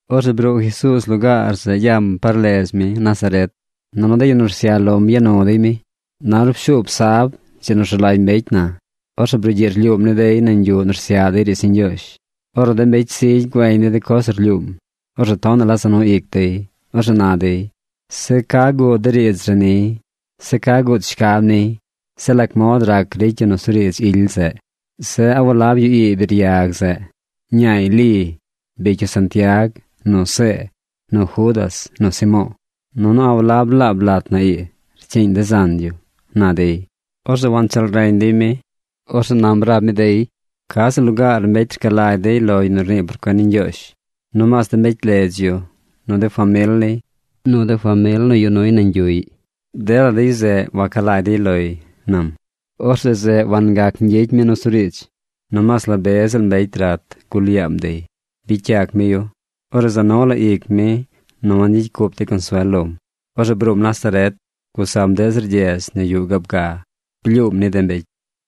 Orzeꞌ bruu Jesuuz lugaar zeꞌ yam par ledz mi, Nazaret. Nunu de yu nu rsyaꞌ lom ya nu dey mi. Na ornu pshuub sab, dzi nu rzu lagy mbecy na, orzeꞌ brugyiꞌ rlyuum ni dey nañ yuꞌ nu rsyaꞌ dey riidz ni Ñgyoozh. Ornu de mbecy zigy güeñ dey de coz nu rlyuum, orzeꞌ tonaꞌ la za nu ic dey. Orzeꞌ na dey: ―Zeꞌ ¿ca guud de riidz re niy? Zeꞌ ¿ca guud shcab niy? Zeꞌ ¿lac mod rac ricy yu nusuriidz ily zeꞌ? Zeꞌ ¿a walab yu ii biryag zeꞌ? Ñaay Li. Bicy yu Santiag, nu See, nu Judas, nu Simo̱o̱. Nunu ¿a walab laab lat na ii rcyiiñ de zan yu? ―na dey. Orzeꞌ wancheel reñ dey mi. Orzeꞌ nam rab mi dey: ―Ca ziꞌl lugaar mbecy rca lagy dey lo yu nu rnii por cuen ni Ñgyoozh, nomaas de mbecy ledz yu, nu de famil niy, nu de famil nu yuꞌ nuy nañ yuꞌy, dela de yu zeꞌ waca lagy dey loy ―nam. Orzeꞌ zeꞌ wangac gyicy mi nusuriidz, nomaas la be ziꞌl mbecy rat gul yaam dey. Bicy yac mi yu. Orzeꞌ za nu la ic mi nu wangyicy cup dey consuel lom. Orzeꞌ bruum Nazaret, gusam deꞌ zir gyedz nu yuꞌ gaab. Blyuum ni de mbecy.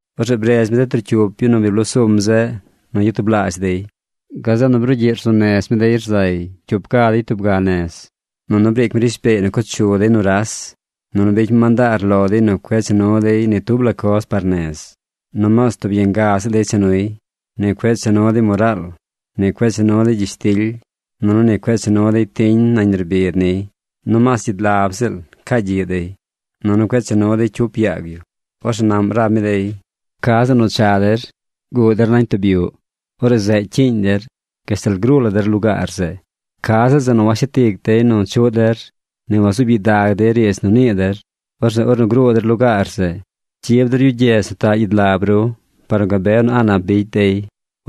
Orzeꞌ bredz mi de trocyup yu nu bi bloo sum zeꞌ nu gyatublaazh dey. Gazeꞌ nu brugyiꞌ rzuu nez mi dey rzay cyup ga dey tub ga nez. Nunu briic mi rishbeey nu co chu dey nuras. Nunu bicy mi mandaar lo dey nu cueꞌ cha nuy ni tub la coz par nez. Nomaas tub yanga ziꞌl dey cha nuy. Ni cueꞌ cha nu dey moraal, ni cueꞌ cha nu dey gyishtily, nunu cueꞌ cha nu dey tiñ nañ nerbid niy. Nomaas gyidlab ziꞌl caa gyiꞌ dey. Nunu cueꞌ cha nu dey cyup yaag yu. Orzeꞌ naꞌm rab mi dey: ―Ca zeꞌ nu cha der, guꞌ der nañ tub yuꞌ. Orzeꞌ zeꞌ cyiiñ der gashtal gruu la der lugaar zeꞌ. Ca ziꞌl zeꞌ nu washet ic dey nu chuꞌ der, ni wazuub gyidag dey riidz nu nii der, orzeꞌ ornu gruu der lugaar zeꞌ, cyib der yu gyedz nu taꞌ gyidlab ru par nu gabe nu a̱ꞌ nap bicy dey.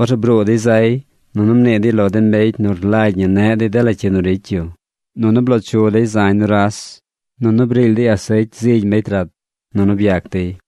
Orzeꞌ bruu dey zay nunu mnii dey lo de mbecy nu rlagy ñi neꞌ dey dela cyi nu ricy yu. Nunu bloo chu dey zañ nuras. Nunu briily dey asecy zigy mbecy rat. Nunu byac dey.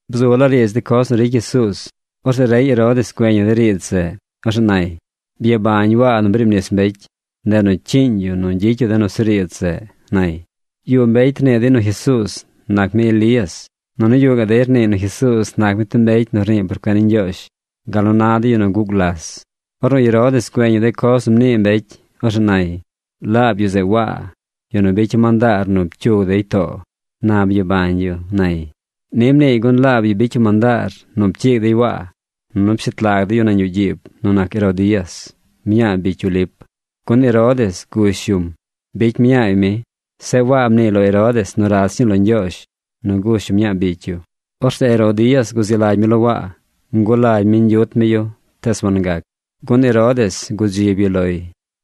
Bzu laa riidz de coz nu ricy Jesuuz. Orzeꞌ rey Herodes güeñ yu de riidz zeꞌ. Orzeꞌ nay: ―Byabañ Waa nu briib nis mbecy. Ndeꞌ nu cyiiñ yu nu gyicy yu de nusuriidz zeꞌ ―nay. Yuꞌ mbecy rnii dey nu Jesuuz nac mi Elías. Nunu yuꞌ gaꞌ mbecy rniiy nu Jesuuz nac mi tub mbecy nu rnii por cuen ni Ñgyoozh gal nu na de yu nu guꞌ gulas. Ornu Herodes güeñ yu de coz nu mnii mbecy, orzeꞌ nay: ―Laab yu zeꞌ Waa, yu nu bicya̱ mandaar nu pcyug dey too. Na byabañ yu ―nay. Ni mniiy gun laab yu bicy yu mandaar nu pcyiig dey Waa, nunu pshet lag dey yu nañ yuꞌ gyiib nu nac Herodías, mñaa bicy yu Lip, gun Herodes gush yum. Bicy mñaay mi. Zeꞌ Waa mniiy lo Herodes nu rach ñii lo Ñgyoozh nu gush yu mñaa bicy yu. Orzeꞌ Herodías guzi lagy mi lo Waa. Ngulagy mi ñgyut mi yu tees wangac, gun Herodes gudzib yu loy.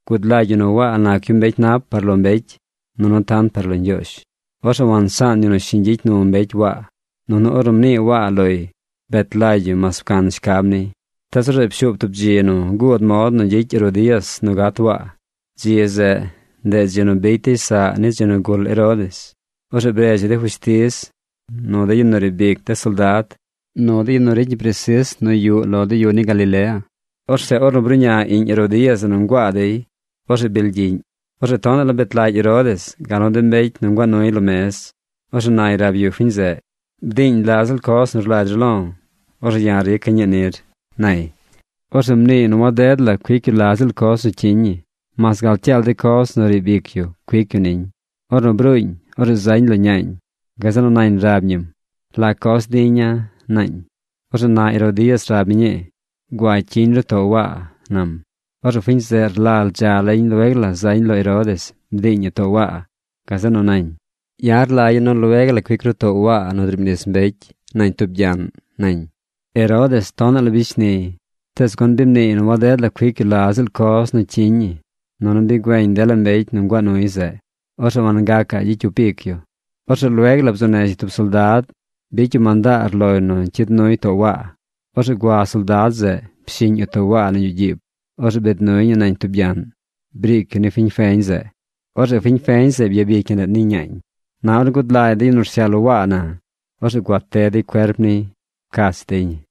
Gud lagy yu nu Waa nac yu mbecy nap par lo mbecy, nunu tant par lo Ñgyoozh. Orzeꞌ wansaan yu nu shiñ gyicy nu mbecy Waa. Nunu ornu mnii Waa loy, bet lagy yu mas pcan shcab niy. Tees orzeꞌ pshuub tub dzi nu guud mod nu gyicy Herodías nu gat Waa. Dzi zeꞌ, ndeꞌ dzi nu bicy dey saꞌ ni dzi nu gul Herodes. Orzeꞌ bredz yu de fushtiz, nu de yu nu riib ic de soldad, nu de yu nu ricy ñi presis nu yuꞌ lo de yu ni Galilea. Orzeꞌ ornu bruꞌña iꞌñ Herodías zeꞌ nu nguaa dey, orzeꞌ bily gyiꞌñ. Orzeꞌ tonaꞌ la bet lagy Herodes gal nu de mbecy nu nguaa nuy lo mez. Orzeꞌ nay rab yu fiñ zeꞌ: ―Bdiiñ la ziꞌl coz nu rlagy ru lo̱. Orzeꞌ ya̱ rica̱ ñii nir ―nay. Orzeꞌ mniiy nu waded la cuic yu la ziꞌl coz nu cyiñ ñi mas gal cyaal de coz nu riib ic yu cuic yu niñ. Ornu bruuñ, orzeꞌ zañ lo ñaañ. Gazeꞌ nu nañ rab ñim: ―¿La coz diña̱? ―naañ. Orzeꞌ na Herodías rab mi ñii: ―Gua cyiñ ru too Waa ―nam. Orzeꞌ fiñ zeꞌ rlal dza lañ lueg la zañ lo Herodes bdiiñ ñi too Waa. Gazeꞌ nu nañ: ―Ya̱ rlagya̱ nu lueg la cuic ru too Waa nu driib nis mbecy nañ tub gyaꞌn ―nañ. Herodes tonaꞌ la bicy shniy. Tees gun bi mniiy nu waded la cuic yu la ziꞌl coz nu cyiñ ñi nunu bi güeñ dela mbecy nu nguaa nuy zeꞌ, orzeꞌ wangacaꞌ gyicy cyup ic yu. Orzeꞌ lueg la bzuu nez yu tub soldad bicy yu mandaar loy nu cyid nuy too Waa. Orzeꞌ gua soldad zeꞌ, pshiñ yu too Waa nañ yuꞌ gyiib. Orzeꞌ biid nuy ñi nañ tub gyaꞌn. Briic yu ni fiñ feñ zeꞌ. Orzeꞌ fiñ feñ zeꞌ byabic ñi ndeꞌ ni ñaañ. Na ornu gud lagy de yu nu rsyaꞌ lo Waa na, orzeꞌ gua te dey cuerp niy. Pcach dey ñi.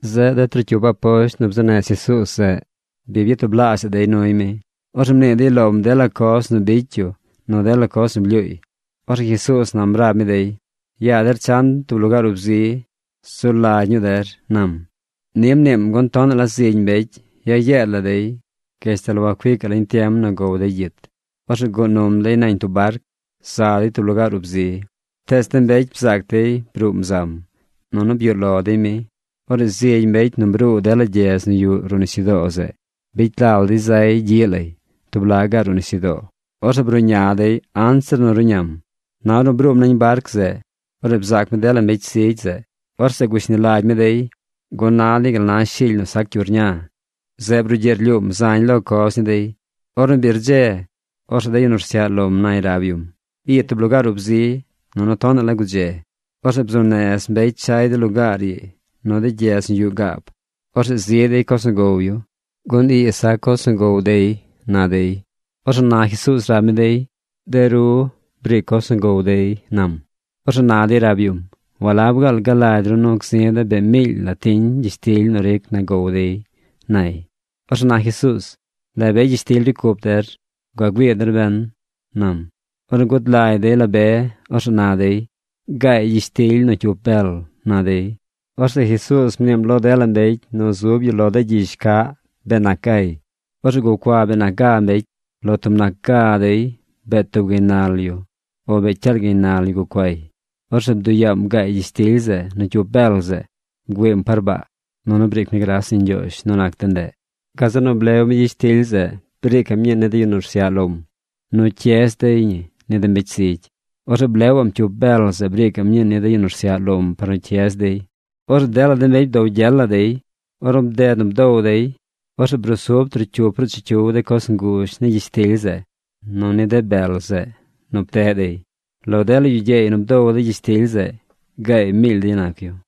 Zeꞌ de trocyup aposht nu bzuu nez Jesuuz zeꞌ bi byatublaazhaꞌ dey nuy mi. Orzeꞌ mnii dey lom dela coz nu bicy yu nu dela coz nu blyuuy. Orzeꞌ Jesuuz nam rab mi dey: ―Yaa der chan tub lugaar ub zi. Zu lagy ñuu der ―nam. Ni mniim gun tonaꞌ la zigy mbecy ya yeed la dey gashtal wacuicaꞌ lañ tiem nu gow dey gyit. Orzeꞌ guꞌ num dey nañ tub barc. Za dey tub lugaar ub zi. Tees de mbecy bzaac dey bruum zam, nunu byuꞌ lo dey mi. Orzeꞌ zigy mbecy nu bruu dela gyedz nu yuꞌ ruꞌ nisyudoo zeꞌ, bicy lal dey zay gyiꞌ lay tub laꞌ gaꞌ ruꞌ nisyudoo. Orzeꞌ bruꞌña dey anzir nu ruꞌñam. Na ornu bruum nañ barc zeꞌ, orzeꞌ bzaac mi dela mbecy zigy zeꞌ. Orzeꞌ gushni lagy mi dey, gun na dey gal na shily nu sac cyu rña. Zeꞌ brugyiꞌ rlyuum zañ lo coz ni dey. Ornu bi rdze, orzeꞌ de yu nu rsyaꞌ lom nay rab yum: ―Ii tub lugaar ub zi nunu tonaꞌ la gudze. Orzeꞌ bzuu nez mbecy chay de lugaar ii nu de gyedz nu yuꞌ gaab. Orzeꞌ zi dey coz nu gow yu, gun ii sac coz nu gow dey ―na dey. Orzeꞌ na Jesuuz rab mi dey: ―De ru, briic coz nu gow dey ―nam. Orzeꞌ na dey rab yum: ―¿Walab gaal galagy ru nu gzi̱ de̱ bee miily la tiñ gyishtily nu ricy na gow dey? ―nay. Orzeꞌ na Jesuuz: ―¿La be gyishtily ricy cup der? Gua güii der ben ―nam. Ornu gud lagy dey la be, orzeꞌ na dey: ―Gaay gyishtily nu cyup bel ―na dey. Orzeꞌ Jesuuz mniim lo dela mbecy nu zub yu lo de gyizh caꞌ bee nac gay. Orzeꞌ gucua bee nac ga mbecy. Lo tub nac ga dey bee tub gaynal yu o bee cyaal gaynal yu gucuay. Orzeꞌ bduꞌ yaam gaay gyishtily zeꞌ nu cyup bel zeꞌ. Bgüiim par baa. Nunu briic mi gras ni Ñgyoozh nu nac de ndeꞌ. Gazeꞌ nu blew mi gyishtily zeꞌ briicaꞌm ñii ni de yu nu rsyaꞌ lom nu cyez dey ñi ni de mbecy zigy. Orzeꞌ blewaꞌm cyup bel zeꞌ briicaꞌm ñii ni de yu nu rsyaꞌ lom par nu cyez dey. Orzeꞌ dela de mbecy bdow gyel la dey. Ornu bded nu bdow dey, orzeꞌ brusub trocyup ruꞌ chicyiw de coz nguzh ni gyishtily zeꞌ nu ni de bel zeꞌ nu pteꞌ dey. Lo dela yu gyeey nu bdow de gyishtily zeꞌ, gaay miily dey nac yu.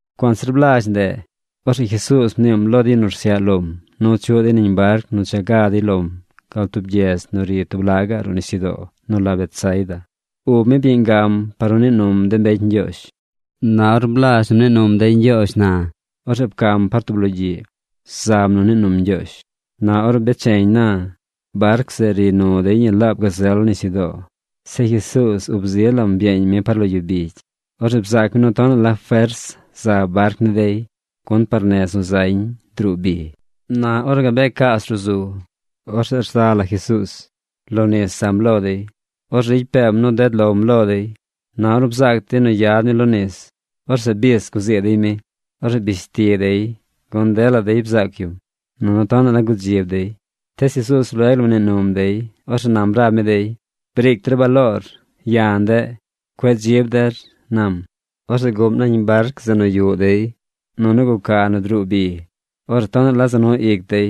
Cuanzir blazh ndeꞌ, orzeꞌ Jesuuz mniim lo de yu nu rsyaꞌ lom nu chuꞌ dey nañ barc nu cha ga dey lom gal tub gyedz nu ri tub laꞌ gaꞌ ruꞌ nisyudoo nu la Betsaida. Ub mi byeeñ gam par nu nii num de mbecy ñgyoozh. Na or blazh nu mnii num dey ñgyoozh na, orzeꞌ pcam par tub logyiꞌ. Zam nu nii num Ñgyoozh. Na ornu becheñ na, barc zeꞌ ri nu dey ñi laab gazel nisyudoo. Zeꞌ Jesuuz ub zi lam byeeñ mi par lo yu bigy. Orzeꞌ bzaac mi nu tonaꞌ la fers za barc ni dey, gun par nez nu zañ druu bi. Na ornu gabee caas ruꞌ zu, orzeꞌ rza la Jesuuz. Lo nis zam lo dey. Orzeꞌ ricy peem nu ded lom lo dey. Na ornu bzaac dey nu yad mi lo nis, orzeꞌ bis guzii dey mi. Orzeꞌ bish ti dey. Gun dela dey bzaac yum, nunu tonaꞌ la gudzib dey. Tees Jesuuz lueg la mnii num dey. Orzeꞌ nam rab mi dey: ―¡Briic der baloor! ¡Ya̱ ndeꞌ! ¡Cueꞌ dzib der! ―nam. Orzeꞌ guꞌm nañ barc zeꞌ nu yuꞌ dey, nunu guca nu druu bi. Orzeꞌ tonaꞌ la za nu ic dey,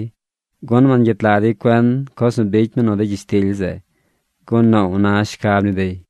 gun wangyet lag dey cuen coz nu bicy mi nu de gyishtily zeꞌ. Gun noow na shcab ni dey.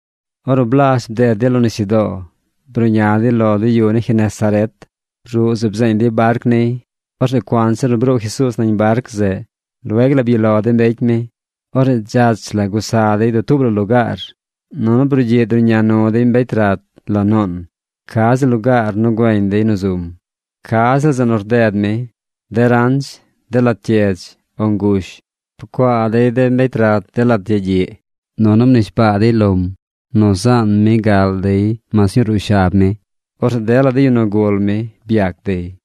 Ornu blazh bded dey lo nisyudoo, bruꞌña dey lo de yu ni Genesaret. Ruꞌ zeꞌ bzeeñ dey barc niy. Orzeꞌ cuanzir nu bruu Jesuuz nañ barc zeꞌ, lueg la byuꞌ lo de mbecy mi. Orzeꞌ dzach la gusa dey dutuub la lugaar, nunu brugyiꞌ druꞌña nu dey mbecy rat lo nuun ca ziꞌl lugaar nu güeñ dey nu zum. Ca ziꞌl zeꞌ nu rded mi, de ranch, de lat gyedz, o ngush, pcuaa dey de mbecy rat de lat yagyiꞌ, nunu mnishbaa dey lom nu zaan mi gal dey mas ñuu ruꞌ shab mi. Orzeꞌ dela de yu nu gul mi byac dey.